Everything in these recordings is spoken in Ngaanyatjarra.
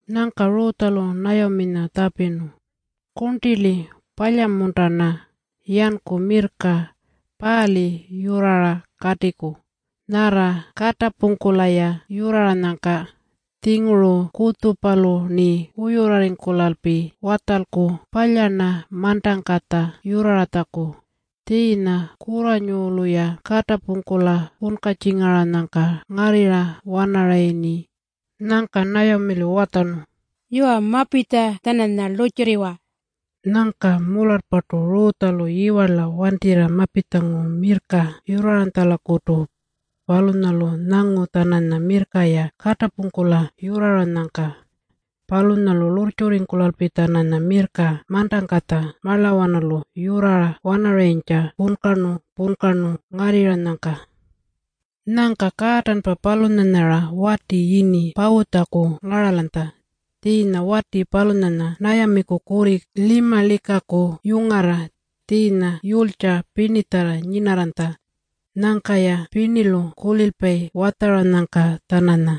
Nyangka Rutjalu Nayaminya tjapirnu, “Kurntili, palya-munta-rna yanku mirrka paali yurrara katiku, nyarra katapungkula-ya yurraranyangka? Tjinguru kutjupalu-rni wuyurrarringkulalpi watjalku palya-rna mantangkatja yurraratjaku, tjiinya kurranyulu-ya katapungkula punkatjingaranyangka ngarrirra-wanarayirni.” Nyangka Nayamilu watjarnu, “Yuwa, mapitja-tjananya lurrtjurriwa.” Nyangka mularrpartu Rutjalu yiwarla wantirra mapitjangu mirrka yurraranytjalakutu. Palunyalu nyangu-tjananya mirrka-ya katapungkula yurraranyangka. Palunyalu lurrtjurringkulalpi-tjananya mirrka mantangkatja marlawanalu yurrara-wanarayintja punkarnu-punkarnu ngarrirranyangka. Nyangka kaatanpa palunyanya-ra wati yini Pawutjaku ngaralanytja. Tjiinya wati palunyanya Nayamiku kurri Limalikaku yungarra, tjiinya yulytja pirnitjarra nyinarranytja. Nyangka-ya pirnilu kulilpayi watjaranyangka-tjananya.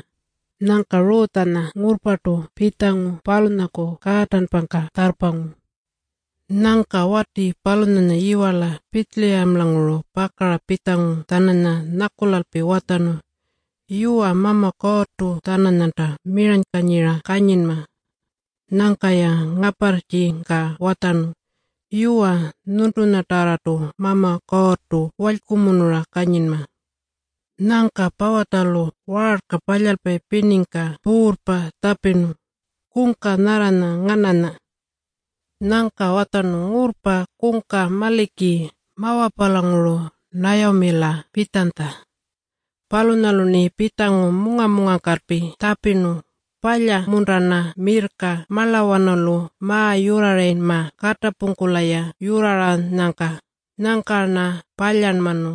Nyangka Rutjanya ngurrpartu pitjangu palunyaku kaatanpangka tjarrpangu. Nyangka wati palunyanya yiwarla Pitjiliyamalanguru pakara pitjangu-tjananya nyakulalpi watjarnu, “Yuwa, Mama Kuurrtu-tjananyanta miranykanyira kanyinma.” Nyangka-ya ngaparrtjika watjarnu, “Yuwa, nyuntunyatarrartunta Mama Kuurrtu walykumunura kanyinma.” Nyangka Pawutjalu waarka palyalpayi pirniku puurrpa tjapirnu, “Kungka nyarranya ngananya?” Nyangka watjarnu, “Ngurrpa. Kungka maliki, Mawapalanguru Nayamila pitjanytja. Palunyalu-rni pitjangu munga-mungangkalpi tjapirnu, ‘Palya-munta-rna mirrka marlawanalu ma-yurrarayinma katapungkula-ya yurraranyangka?’ Nyangka-rna palyarnmanu.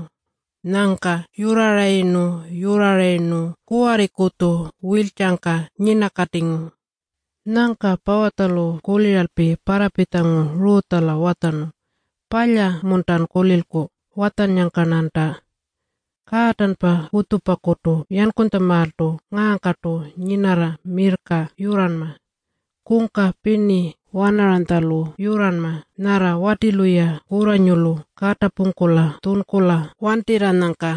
Nyangka yurrarayirnu-yurrarayirnu kuwarrikutju wiltjangka nyinakatingu.” Nyangka Pawutjalu kuliralpi parrapitjangu Rutjala watjarnu, “Palya-muntan kulilku watjannyangka-rnanta? Kaatanpa kutjupakutu yankutjamaaltu ngaangkartu nyinarra mirrka yurranma. Kungka pirni wanaranytjalu yurranma nyarra watilu-ya kurranyulu katapungkula tjunkula wantirranyangka.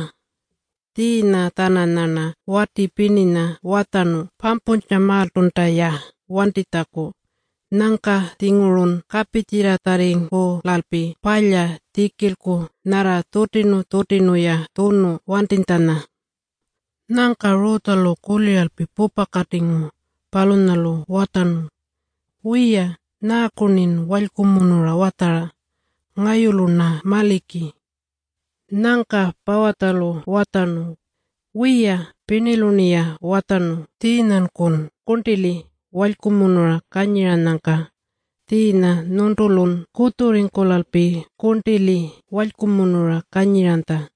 Tjiinya-tjananyarna wati pirninya watjarnu pampuntjamaaltunta-ya wantitjaku. Nyangka-tjingurun kapitjirratjarringkulalpi palya tjikilku nyarra tjutirnu-tjutirnu-ya tjunu wantinytjanya.” Nyangka Rutjalu kuliralpi pupakatingu. Palunyalu watjarnu, “Wiya, nyaaku-rnin walykumunura watjara? Ngayulu-rna maliki.” Nyangka Pawutjalu watjarnu, “Wiya, pirnilu-rniya watjarnu tjiinyankun kurntili walykumunura kanyiranyangka. Tjiinya nyuntulun kutjurringkulalpi kurntili walykumunura kanyiranytja.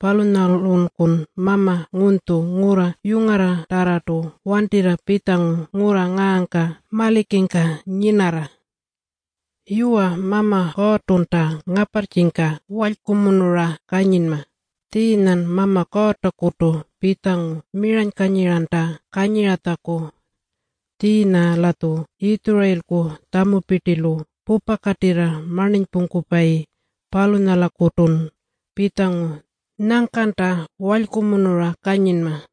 Palunyalunkun mama ngunytju, ngurra yungarratarrartu wantirra pitjangu ngurra ngaangka malikingka nyinarra. Yuwa, Mama Kuurrtunta ngaparrtjika walykumunura kanyinma. Tjiinyan Mama Kuurrtakutu pitjangu miranykanyiranta kanyiratjaku. Tjiinya-latju Yitjurayilku tjamupirtilu pupakatirra marninypungkupayi, palunyalakutun pitjangu. Nyangkanta walykumunura kanyinma.”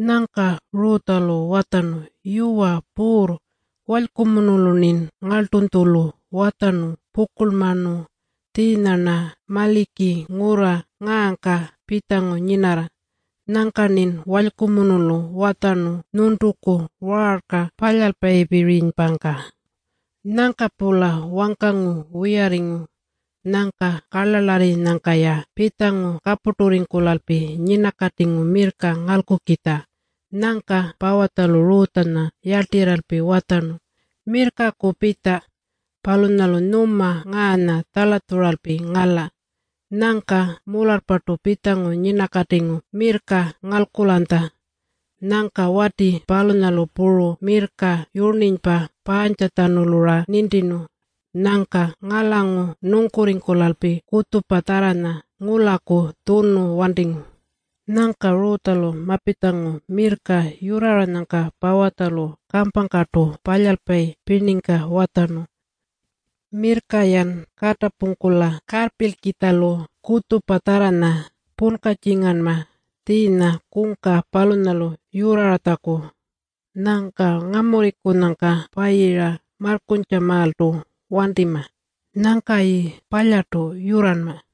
Nyangka Rutjalu watjarnu, “Yuwa Puurr, walykumunulu-rnin ngarltunytjulu watjarnu pukurlmanu. Tjiinya-rna maliki ngurra ngaangka pitjangu nyinarra. Nyangka-rnin walykumunulu watjarnu nyuntuku waarka palyalpayipirinypangka.” Nyangka-pula wangkangu wiyarringu. Nyangka karlarlarrinyangka-ya pitjangu kapurturringkulalpi nyinakatingu mirrka ngalkukitja. Nyangka Pawutjalu Rutjanya yarltirralpi watjarnu, “Mirrkaku pitja. Palunyalu nyuma ngaanya tjalatjuralpi ngala.” Nyangka mularrpartu pitjangu nyinakatingu mirrka ngalkulanytja. Nyangka wati palunyalu puru mirrka yurninypa paantjatjanulu-ra nintirnu. Nyangka ngalangu nungkurringkulalpi kutjupatjarranya ngulaku tjunu wantingu. Nyangka Rutjalu mapitjangu mirrka yurraranyangka Pawutjalu kampangkartu palyalpayi pirningka watjarnu, “Mirrka-yan katapungkula karrpilkitjalu kutjupatjarranya punkatjinganma tjiinya kungka palunyalu yurraratjaku. Nyangka ngamurrinyangka payira marrkuntjamaaltu wantima. Nyangkayi palyartu yurranma.”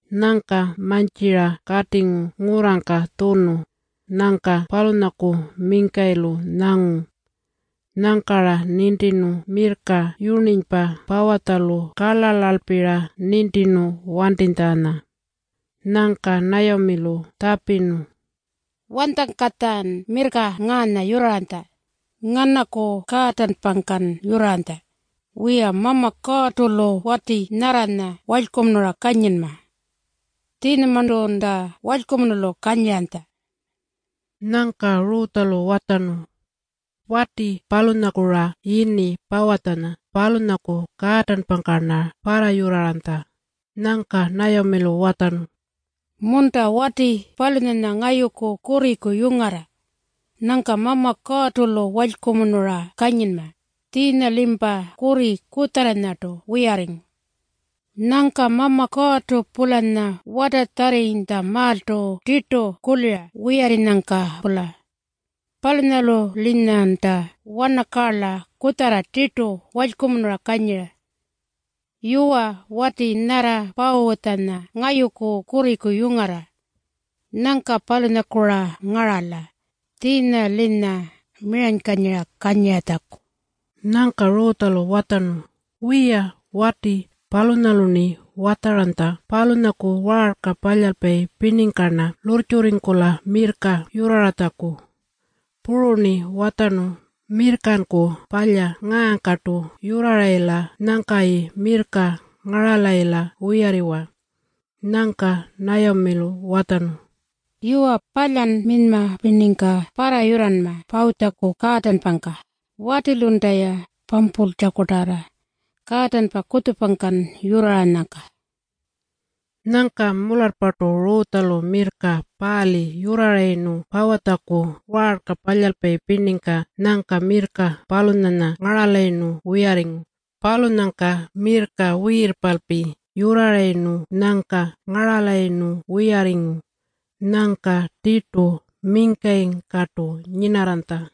Nyangka mantjira katingu ngurrangka tjunu. Nyangka palunyaku mingkayilu nyangu. Nyangka-ra nintirnu mirrka yurninypa Pawutjalu karlarlalpi-ra nintirnu wantitjanya. Nyangka Nayamilu tjapirnu, “Wanytjangkatjan mirrka ngaanya yurraranytja? Nganaku kaatanpangkan yurraranytja? Wiya, Mama Kuurrtu-lu wati nyarranya walykumunura kanyinma. Tjiinyamarntunta walykumunulu kanyiranytja.” Nyangka Rutjalu watjarnu, “Wati palunyaku-ra yini Pawutjanya. Palunyaku kaatanpangka-rna parrayurraranytja.” Nyangka Nayamilu watjarnu, “Munta! Wati palunyanya ngayuku kurriku yungarra. Nyangka Mama Kuurrtu-lu walykumunura kanyinma. Tjiinya-limpa kurri kutjarranyartu wiyarringu. Nyangka Mama Kuurrtu-pulanya watatjarrinytjamaaltu tirtu kulira wiyarrinyangka-pula. Palunyalu-linyanta wanakaarla kutjarra tirtu walykumunura kanyira. Yuwa, wati nyarra Pawutjanya ngayuku kurriku yungarra. Nyangka palunyaku-ra ngarala tjiinya-linya miranykanyira kanyiratjaku.” Nyangka Rutjalu watjarnu, “Wiya, wati palunyalu-rni watjaranytja palunyaku waarka palyalpayi pirningka-rna lurrtjurringkula mirrka yurraratjaku. Puru-rni watjarnu, ‘Mirrkanku palya ngaangkartu yurrarayila nyangkayi mirrka ngaralayila wiyarriwa.’” Nyangka Nayamilu watjarnu, “Yuwa, palyan minyma pirningka parrayurranma Pawutjaku kaatanpangka, watilunta-ya pampultjakutarra kaatanpa kutjupangkan yurraranyangka.” Nyangka mularrpartu Rutjalu mirrka paali yurrarayirnu Pawutjaku waarka palyalpayi pirningka nyangka mirrka palunyanya ngaralayirnu wiyarringu. Palunyangka mirrka wiirpalpi yurrarayirnu nyangka ngaralayirnu wiyarringu. Nyangka tirtu mingkayingkartu nyinarranytja.